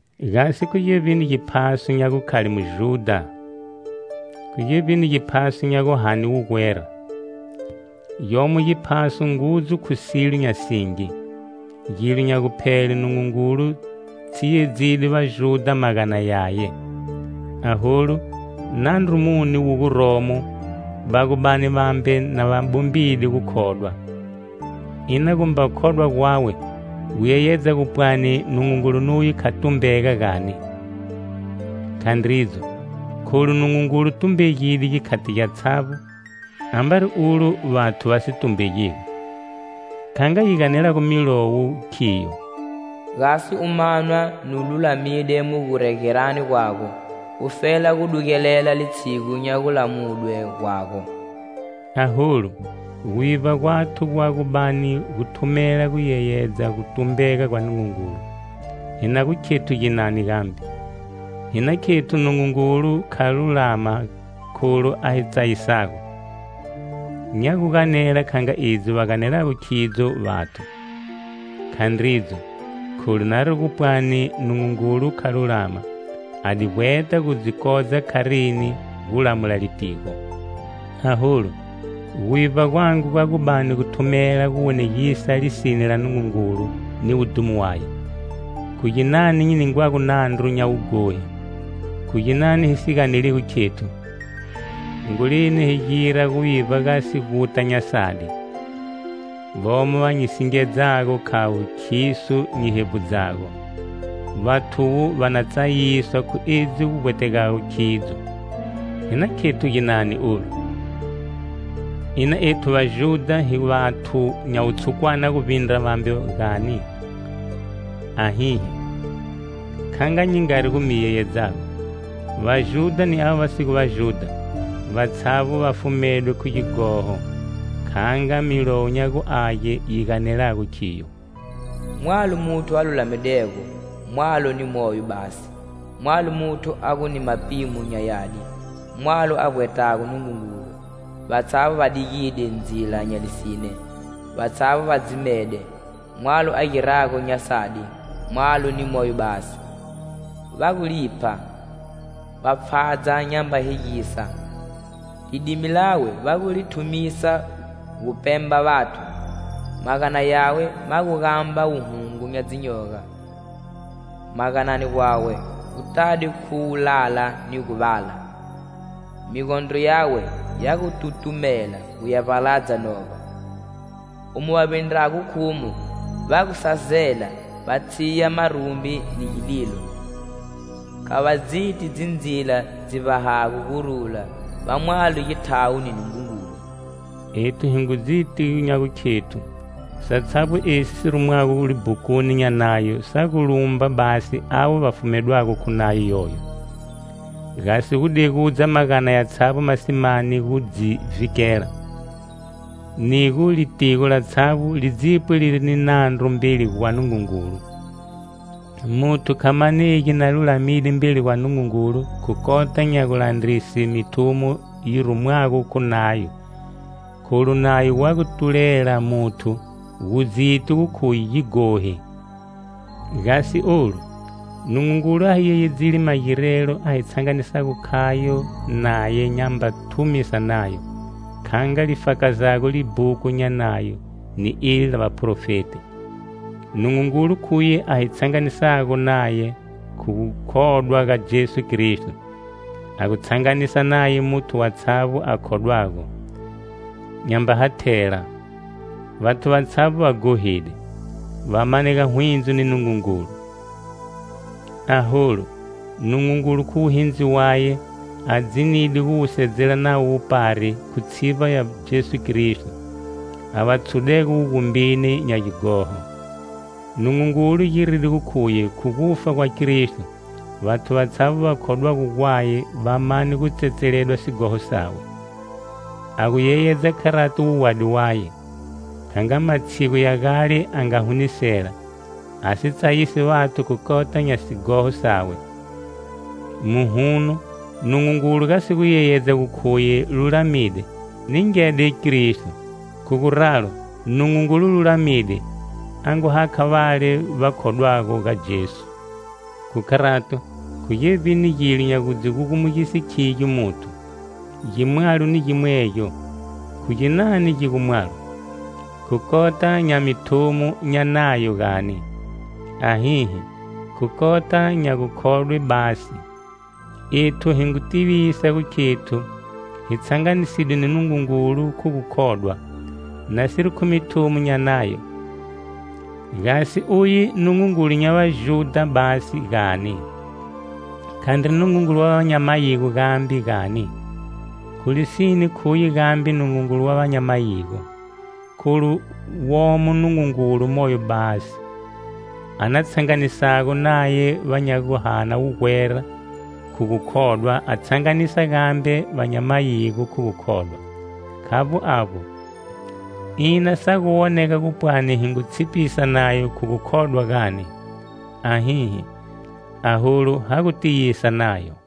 Gasi khu gevbini giphaso nya gukhale Mujudha? Khu gevbini giphaso nya guhane wugwera? Gyomo giphaso ngudzu khu silo nya singi. Gilo nya guphele, Nungungulu tshiyedzide Vajudha magana yaye. Aholu, nandru muni wu guromo va gu bani vambe na va bombide gukhodwa? Ina gu mba khodwa gwawe gu yeyedza gu pwani Nungungulu nuye kha tumbega gani? Khandridzo. Kholu Nungungulu tumbegide gikhati gyatshavbo ambari ulo vathu va si tumbegigo. Kha nga yi ganelago Milowo khiyo: "Gasi u manwa nu lulamide mu guregerani gwago,ufela gu dugelela litshigu nya gulamudwe gwago" Aholu, guvivba gwathu gwa gu bani gu thumela guyeyedza gutumbega gwa Nungungulu, hi na gu khethu ginani gambe? Hi na khethu Nungungulu kha lulama kholu a hi tsayisago? (Nya gu ganela kha nga edzi va ganelago khidzo vathu). Khandridzo.Kholu nari gu pwani Nungungulu kha lulama, a di vbweta gu dzi kodza kharini gu lamula litigo? Aholu, guvivba gwangu gwa gu bani gu thumela gu wonegisa lisine la Nungungulu ni wudhumo waye, khu ginani nyi ningwago nandru nya wughohi? Khu ginani hi si ganeligo khethu: "Hongoleni hi gira guvivba gasi guta nya sadi." Vomo va nyi singedzago khavo khiso nyi hevbudzago. Vathuvo va na tsayiswa khu edzi gu vbwategago khidzo. Hi na khethu ginani olu? Ina ethu Vajudha hi vathu nya wutshukwana guvbindra vambe, gani? Ahihi. Kha nga nyi ngari gu mi yeyedzago, Vajudha ni ava va si gu Vajudha, vatshavbo va fumedwe khu gighoho. Kha nga Milowo nya gu Age yi ganelago khiyo: "Mwalo muthu a lulamidego.Mwalo ni moyo basi. Mwalo muthu a gu ni mapimo nya yadi.Mwalo a vbwetago Nungungulu. Vatshavbo va digide ndzila nya lisine,vatshavbo va dzimede.Mwalo a girago nya sadi.Mwalo ni moyo basi. Va gu lipha, va pfhadza nyamba hegisa.Lidimi lawe va gu li thumisa gupemba vathu.Magana yawe ma gu gamba wuhungu nya dzinyoga. Maganani gwawe gu tade khu wulala ni guvala. Migondro yawe ya gu tutumela gu ya vbaladza novba. Umo va vbindrago khumo va gu sazela,va tshiya marumbi ni gililo. Kha va dziti dzindzila dzi vbahago gurula, va mwalo githawo ni Nungungulu." Ethu hi ngu dziti nya gukhethu satshavbo esi si rumwago libhukuni nya Nayo sa gu lumba basi avo va fumedwago khu nayo yoyo, gasi gu degudza magana yatshavbo ma si mani gu dzi vhikela, ni gu litigo latshavbo li dzipwe liri ni nandru mbeli gwa Nungungulu. Muthu kha manegi na lulamide mbeli gwa Nungungulu khu kota nya gulandrise mithumo yi rumwago khu Nayo; kholu Nayo wa gu tulela muthu gu dziti gu khuye gighohi. Gasi olu, Nungungulu a hi yeyedzide magirelo a hi tshanganisago khayo naye nyamba thumisa Nayo, kha nga li fakazago libhuku nya Nayo ni eli la Vaprofeti. Nungungulu khuye a hi tshanganisago naye khu gukhodwa ga Jesu Kristo. A gu tshanganisa naye muthu watshavbo a khodwago, nyamba hathela. Vathu vatshavbo va ghohide, va manega hwindzo ni Nungungulu. Aholu, Nungungulu khu wuhindzi waye, a dzinide gu wusedzela navo wupari khu tshivba ya Jesu Kristo, a va tshudego wugumbini nya gighoho. Nungungulu giride gu khuye khu gufa gwa Kristo, vathu vatshavbo va khodwago gwaye va mane gu tsetseledwa sighoho sawe. A gu yeyedza kharati wuwadi waye, kha nga matshigu ya gale a nga hunisela, a si tsayisi vathu khu kota nya sighoho sawe. Muhuno, Nungungulu gasi gu yeyedza gu khuye lulamide, ningede Kristo. Khu guralo Nungungulu lulamide a ngu hakha vale va khodwago ga Jesu. Khu kharato, khu gevbini gilo nya gu dzi gugumugise khigyo muthu? Gimwalo ni gimwegyo. Khu ginani gi gu mwalo? Khu kota nya mithumo nya Nayo gani? Ahihi! Khu kota nya gukhodwe basi. Ethu hi ngu tivisa gu khethu hi tshanganisidwe ni Nungungulu khu gukhodwa, nasiri khu mithumo nya Nayo. Gasi uye Nungungulu nya Vajudha basi, gani? Khandri Nungungulu wa va nya mayigo gambe, gani? Khu lisine khuye gambe Nungungulu wa va nya mayigo, kholu womo Nungungulu moyo basi, a na tshanganisago naye va nya gu hana wugwera khu gukhodwa, a tshanganisa gambe va nya mayigo khu gukhodwa. Khavbo avbo, ina sa gu wonega gupwani hi ngu tshipisa Nayo khu gukhodwa, gani? Ahihi. Aholu ha gu tiyisa Nayo.